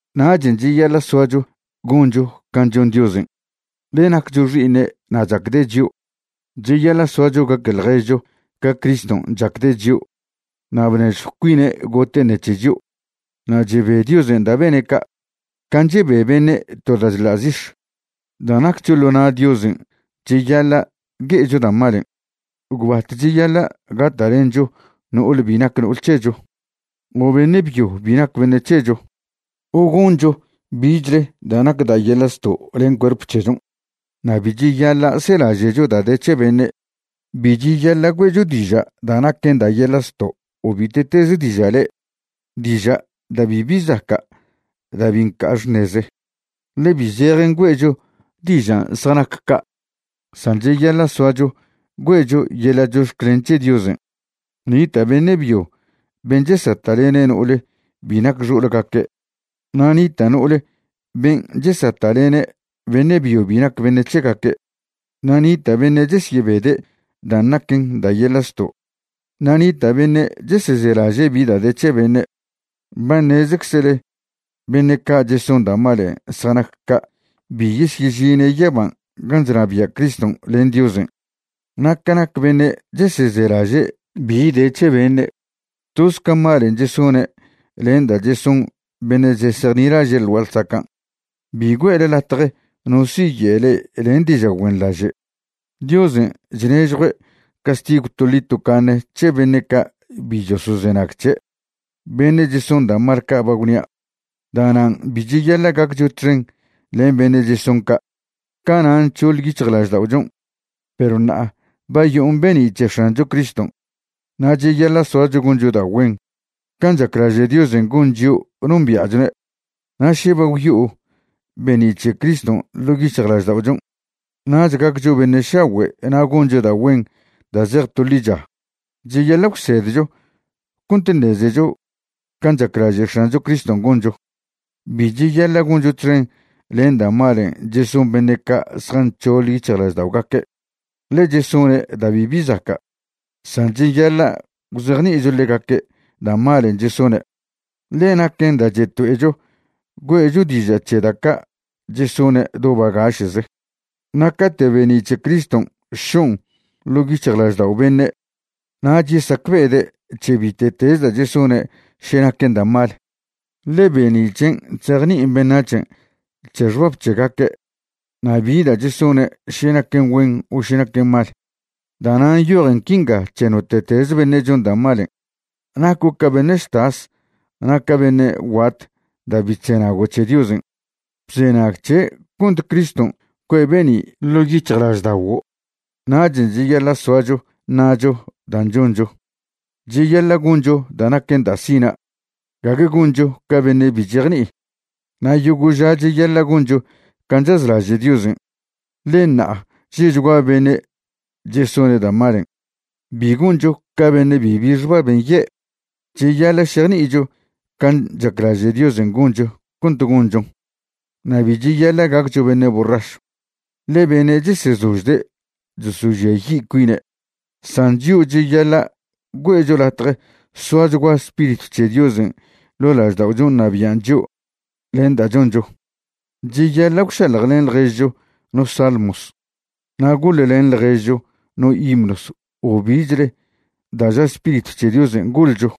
Nachen' cheyaḻa' soacho goncho can' chon Diosen', ḻe naccho xi'iṉe' na' chacde' chio'. Cheyaḻa' soacho gaque ḻježcho ca Criston' chacde' chio' na' bnežjw cuine' gote' ṉec̱he chio'. Na' chebe Diosen' da' bene' ca', can' chebe beṉe' to da' chḻa' zix̱. Da' naccho ḻo na' Diosen' cheyaḻa' gue'echo da' malen'. Gwbatech cheyaḻa' gata'lencho no'ole bi nac no'ol c̱hecho o beṉe' byo bi nac beṉe' c̱hecho o goncho bichle da' nac da' yeḻa' zto' len cuerp c̱hechon'. Na' bi cheyaḻa' selaže'cho da' de c̱he beṉe'. Bi cheyaḻa' güe'cho diža' da' naquen da' yeḻa' zto' o bite'teze diža' le'e, diža' da' bibi zaca' da' bi nca' xṉeze, ḻe bi zejen güe'cho dižan' zjanac ca'. San cheyaḻa' soacho güe'cho yeḻa' chox̱clen c̱he Diosen'. Nita' beṉe' byo ben' chesata'lene' no'ole bi nac xo'olgaque' na' nita' no'ole ben' chesata'lene' beṉe' byo bi nac beṉe' c̱hegaque', na' nita' beṉe' chesyebede' dan' naquen da' yeḻa' zto'; na' nita' beṉe' chesezelaže' bi da' de c̱he beṉe'. Ba ṉezeczele beṉe' ca' cheson da' malen' zjanac ca' bi yesyežine' yaban' gan' chnabia' Criston' len Diosen'. (Na' ca nac beṉe' chesezelaže' bi de c̱he beṉe', toz ca malen' chesone' len da' cheson beṉe' chesejnilaže' ḻ gua'a ḻsacan'.) Bi güe'le latje no siye' le'e len diža' güenḻaže'. Diosen' chnežjue' castigw toḻi tocaṉe c̱he beṉe' ca' bi chosozenag c̱he', beṉe' cheson da' mal ca' ba gwnia'. Da'nan' bi cheyaḻa' gaccho txen len beṉe' cheson ca'. Cana' nc̱hoḻ yic̱hjlažda'ochon', perw ṉa'a ba yo'on be'ni' c̱he X̱ancho Criston', na' cheyaḻa' soacho goncho da' güen can' chaclaže' Diosen' gon chio' nombia'chone'. Na' še ba gwyo'o be'ni' c̱he Criston' ḻo' yic̱hjlažda'ochon', nach gaccho beṉe' šagüe' na' goncho da' güen da' zej to ḻicha. Cheyaḻa' gwsedcho cont ṉezecho can' chaclaže' X̱ancho Criston' goncho. Bi cheyaḻa' goncho txen len da' malen' cheson beṉe' ca' zjanc̱hoḻ yic̱hjlažda'ogaque', ḻe chesone' da' bibi zaca'. San cheyaḻa' gwzejni'icho ḻegaque' da' malen' chesone', ḻe naquen da' cheto'echo güe'cho diža' c̱he da' ca' chesone' do bagaše'ze. Na' cate' be'ni' c̱he Criston' šon' ḻo' yic̱hjlaždao' beṉe', nach yesacbe'ede' c̱he bite'teze da' chesone' še naquen da' mal, ḻe be'ni' c̱hen' chzejni'in beṉac̱hen' c̱he xbab c̱hegaque' na' bi da' chesone' še naquen güen o še naquen mal. Da'nan' nyojen quinga c̱he note'teze beṉe' chon da' malen': Naco' ca beṉe' chtas na' ca beṉe' guat da' bi chzenago' c̱he Diosen'. Bzenag c̱he' cont Criston' cue'e be'ni' ḻo' yic̱hjlažda'oguo'. Nachen' cheyaḻa' soacho ṉa'cho dan' choncho. Cheyaḻa' goncho da' naquen da' sina', gague goncho ca beṉe' bi chejni'i. Na' yogo' ža cheyaḻa' goncho can' chazlaže' Diosen', ḻe ṉa'a že'chgua beṉe' chesone' da' malen'. Bi goncho ca beṉe' bibi xbab nye'. Cheyaḻa' šejni'icho can' chaclaže' Diosen' goncho cont gonchon. Na' bi cheyaḻa' gaccho beṉe' borrašw, ḻe beṉe' chesezožde' chosožiayi' cuine'. San chio' cheyaḻa' güe'cho latje soachgua Spiritw c̱he Diosen' ḻo' lažda'ochon' ṉabian' chio' len da' choncho. Cheyaḻa' gwšaḻjlen ḻježcho no salmos na' goḻlen ḻježcho no himnos o bichle da' ža Spiritw c̱he Diosen' goḻcho.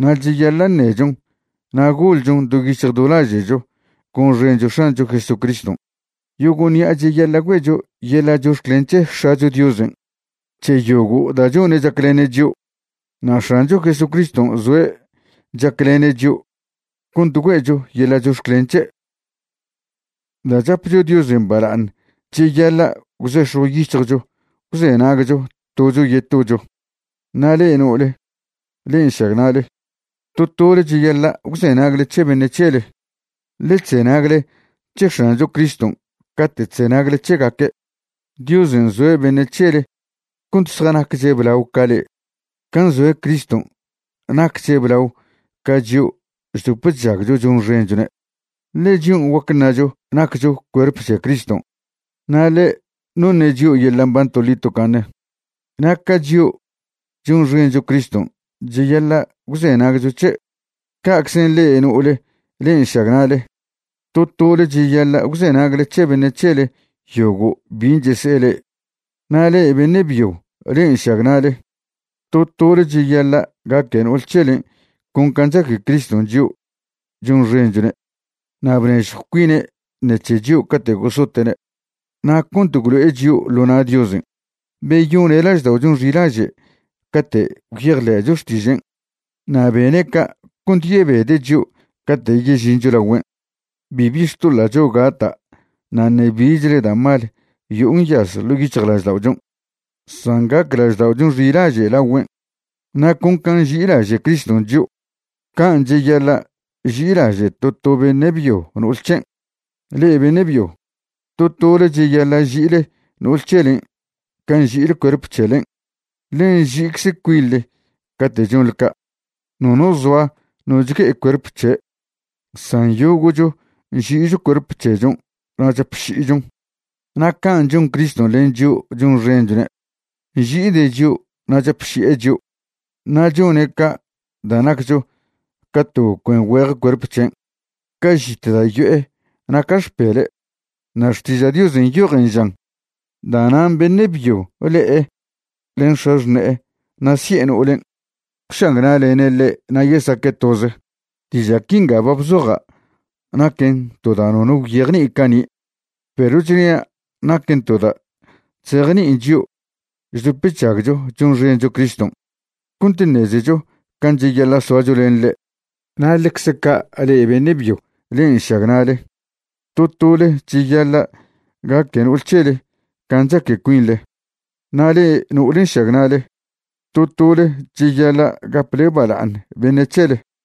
Na' cheyaḻa' ṉechon na' goḻchon do yic̱hj do laže'cho gonxencho X̱ancho Jesucriston'. Yogo' ṉi'a cheyaḻa' güe'cho yeḻa' chox̱clen c̱he X̱acho Diosen' c̱he yogo' da' chone' chaclene' chio'. Na' X̱ancho Jesucriston' zoe' chaclene' chio' cont güe'cho yeḻa' chox̱clen c̱he'. Da' chapcho Diosen' bala'aṉ cheyaḻa' gwzex̱jw yic̱hjcho gwzenagcho tocho yetocho. Na' le'e no'ole, le'e nšagna'le, to tole cheyaḻa' gwzenagle c̱he beṉe' c̱hele, ḻe chzenagle c̱he X̱ancho Criston' cate' chzenagle c̱hegaque'. Diosen' nzoe' beṉe' c̱hele cont zjanacche' blao ca le'e, can' nzoe' Criston' nacche' blao ca chio' chdop chžagcho chonxenchone'. Ḻe chion' guac ṉacho naccho cuerp c̱he Criston', na' ḻe' noṉe' chio' yeḻa' mban toḻi tocaṉe. Na' ca chio' chonxencho Criston' cheyaḻa' gwzenagcho c̱he', ca'czen' ḻe'e no'ole le'e nšagna'le, to tole cheyaḻa' gwzenagle c̱he beṉe' c̱hele yogo' bin' chese'e le'e. Na' le'e beṉe' byo le'e nšagna'le, to tole cheyaḻa' gaque no'ol c̱helen' con can' chaque Criston' chio' chonxenchwne' na' bnežjw cuine' ṉec̱he chio' cate' gosote'ne'. Na' cont gwlo'e chio' ḻo na' Diosen', beyone' lažda'ochon' xilaže' cate' gwyejḻe'cho xtižen'. Na' bene' ca' cont yebede' chio' cate' yežincho lagüen', bibi xtoḻa'cho gata' na' ṉe bichle da' mal yo'o nyaz ḻo' yic̱hjlažda'ochon', san gac lažda'ochon' xilaže' lagüen'. Na' con can' nži'ilaže' Criston' chio', can' cheyaḻa' ži'ilaže' to to beṉe' byo no'ol c̱hen'. Le'e beṉe' byo, to tole cheyaḻa' ži'ile no'ol c̱helen' can' nži'ile cuerp c̱helen', ḻe nži'icze cuinḻe cate' chonḻe ca'. Nono zoa no chgue'e cuerp c̱he', san yogo'cho nži'icho cuerp c̱hechon' na' chapši'ichon. Na' can' chon Criston' len chio' chonxenchone', nži'ide' chio' na' chapši'e chio'. Na' chone' ca' da' naccho ca to cuen güeje cuerp c̱hen', ca žit da' yo'e na' ca xpele'. Na' Xtiža' Diosen' nyojen žan: “Da'nan' beṉe' byo le'e len x̱axṉe'e na' si'e no'olen' gwšagna'lene' ḻe' na' yesaque' toze.” Diža' quinga ba bzoja' naquen to da' nono gwyejni'i cani', perw chnia' naquen to da' chzejni'in chio' chdop chžagcho chonxencho Criston' cont ṉezecho can' cheyaḻa' soacho len ḻe'. Na' ḻecze ca' le'e beṉe' byo le'e nšagna'le, to tole cheyaḻa' gaque no'ol c̱hele can' chaque cuinḻe, na' le'e no'ole nšagna'le, to tole cheyaḻa' gaple bala'aṉ beṉe' c̱hele.